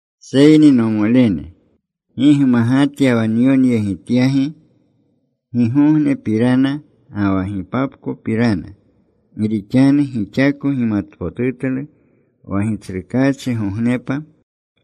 Seyni, nomolene, gi gmagatya wa nyonyegityagi gigognepirana ga wa gipapkopirana. Gi rixanu gixako gimatpotutlu wa Gitsrukaachigognepa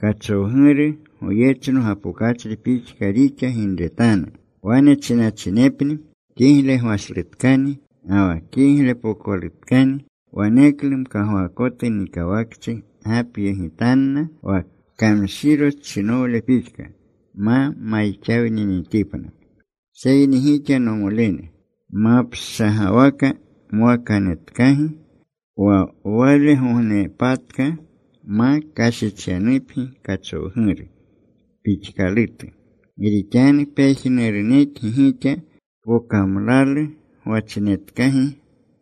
kachowguru goyechno gapokachri pixka rixa ginretanu. Wane chinachinepni, “Kigle gwashlutkani ga wa kiglepokolutkani,” waneklu mkagwaakotu nikawakchi gapyegitanna, wa kamshirochinowle pixka. Ma mayixawninitipna. Seyni gixa, nomolene, mapshagawaka mwakanetkagi, wa walegognepatka ma kashichyanupgi kachowguru pixkalutu. Gi rixanu pejnurunekgi gixa pokamlalu gwachinetkagi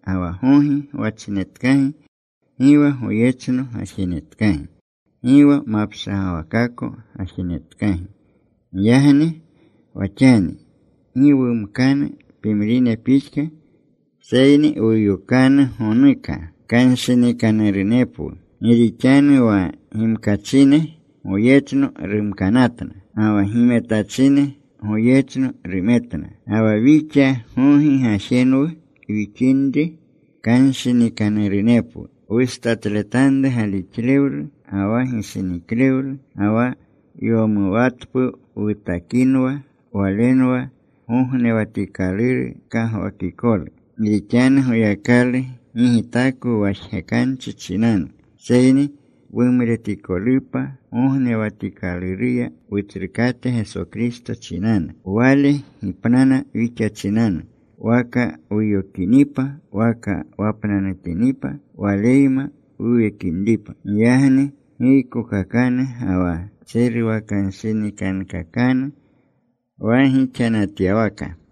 ga wa gogi gwachinetkagi. Gi wa goyechno gajenetkagi. Gi wa mapshagawakako gajenetkagi. Giyagni wa xani gi wumkanu pimrine pixka, seyni wuyokanu gonuka. Kanshinikanurunepwu. Gi rixanu wa gimkachine goyechno rumkanatna. Ga wa gimetachine goyechno rumetna. Ga wa wixa gogi gajenwu wixinri, kanshinikanurunepwu. Wustatletanru galixlewlu ga wa gishiniklewlu. Ga wa yowumatpu wutakinwa. Walenwa gognewatikaluru kagwakikolu. Gi rixanu Goyakalu gi gitakwu wa jgekanchi chinanu, seyni wumretikolupa gognewatikaluruya Wutsrukate Geso Kristo chinanu. Wale gipnana wixa chinanu, waka wuyokinipa waka wapnanutinipa, Waleyma wuwekinripa. Giyagni giykokakanu ga wa ntseruwakanshinikankakanu wa gixanatyawaka.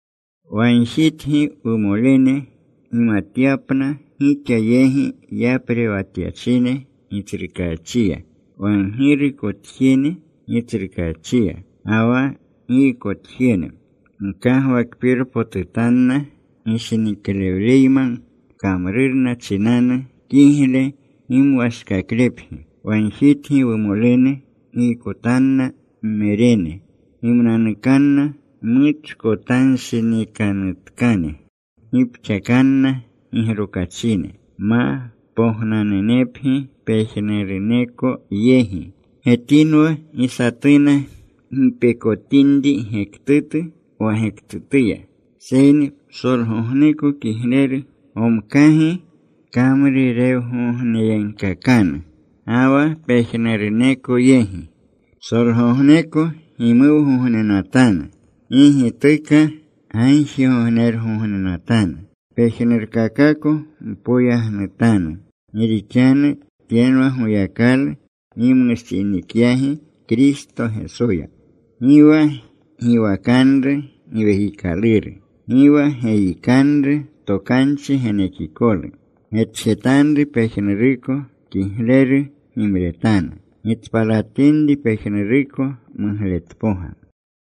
Wagjitgi, wumolene, gimatyapna gixa yegi yaprewatyachine Gitsrukachiya, wa ggirukotjene Gitsrukaachiya, ga wa giykotjene. Gkagwakpirpotutanna gishiniklewleyma kamrurna chinanu. Kigle gimwashkaklepgi. Wagjitgi, wumolene, giykotanna mmerene. Gimnanukanna mmuchkotanshinikanutkane. Gipxakanna gigrokachine. Ma pognanunepgi pejnuruneko yegi. Getinwa gi satuna gipekotinri gektutu wa gektutuya, seyni psolgogneko kigleru gomkagi kamruregogneyegkakanu, ga wa pejnuruneko yegi. Psolgogneko gimuwgognenatanu. Gi gituka gagjigognergognenatanu. Pejnurkakako mpoyagnutanu. Gi rixanu tyenwa Goyakalu gimushinikyagi Kristo Gesoya. Gi wa giwakanru Giwekikaluru. Gi wa geyikanru tokanchi genekikolu. Getjetanru pejnuruko. Kigleru gimretanu. Gitspalatinri pejnuruko mugletpoga.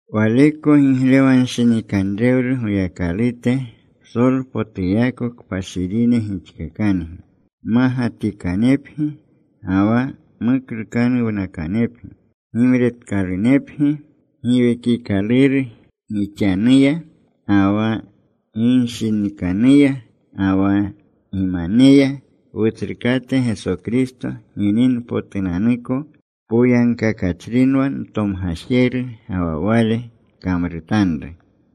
Waleko giglewanshinikanrewlu Goyakalute psolpotuyako kpashirine gixkakangi. Mmagatikanepgi ga wa muklukanuwnakanepgi gimretkalunepgi giwekikaluru gixanuya, ga wa ginshinikanuya, ga wa gimaneya, Wutsrukate Geso Kristo gininpotunanuko. Poyagkakachrinwa ntomgajeru, ga wa Wale kamrutanru.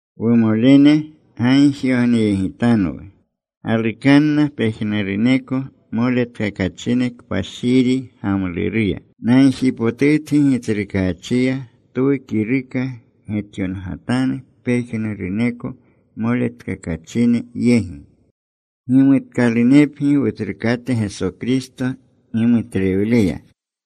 Wumolene, gagjigogneyegitanwu. Galukanna pejnuruneko moletkakachine kpashiri gamluruya. Nagjipotutgi Gitsrukaachiya twu kiruka getyongatanu pejnuruneko moletkakachine yegi. Gimutkalunepgi Wutsrukate Geso Kristo gimutlewleya.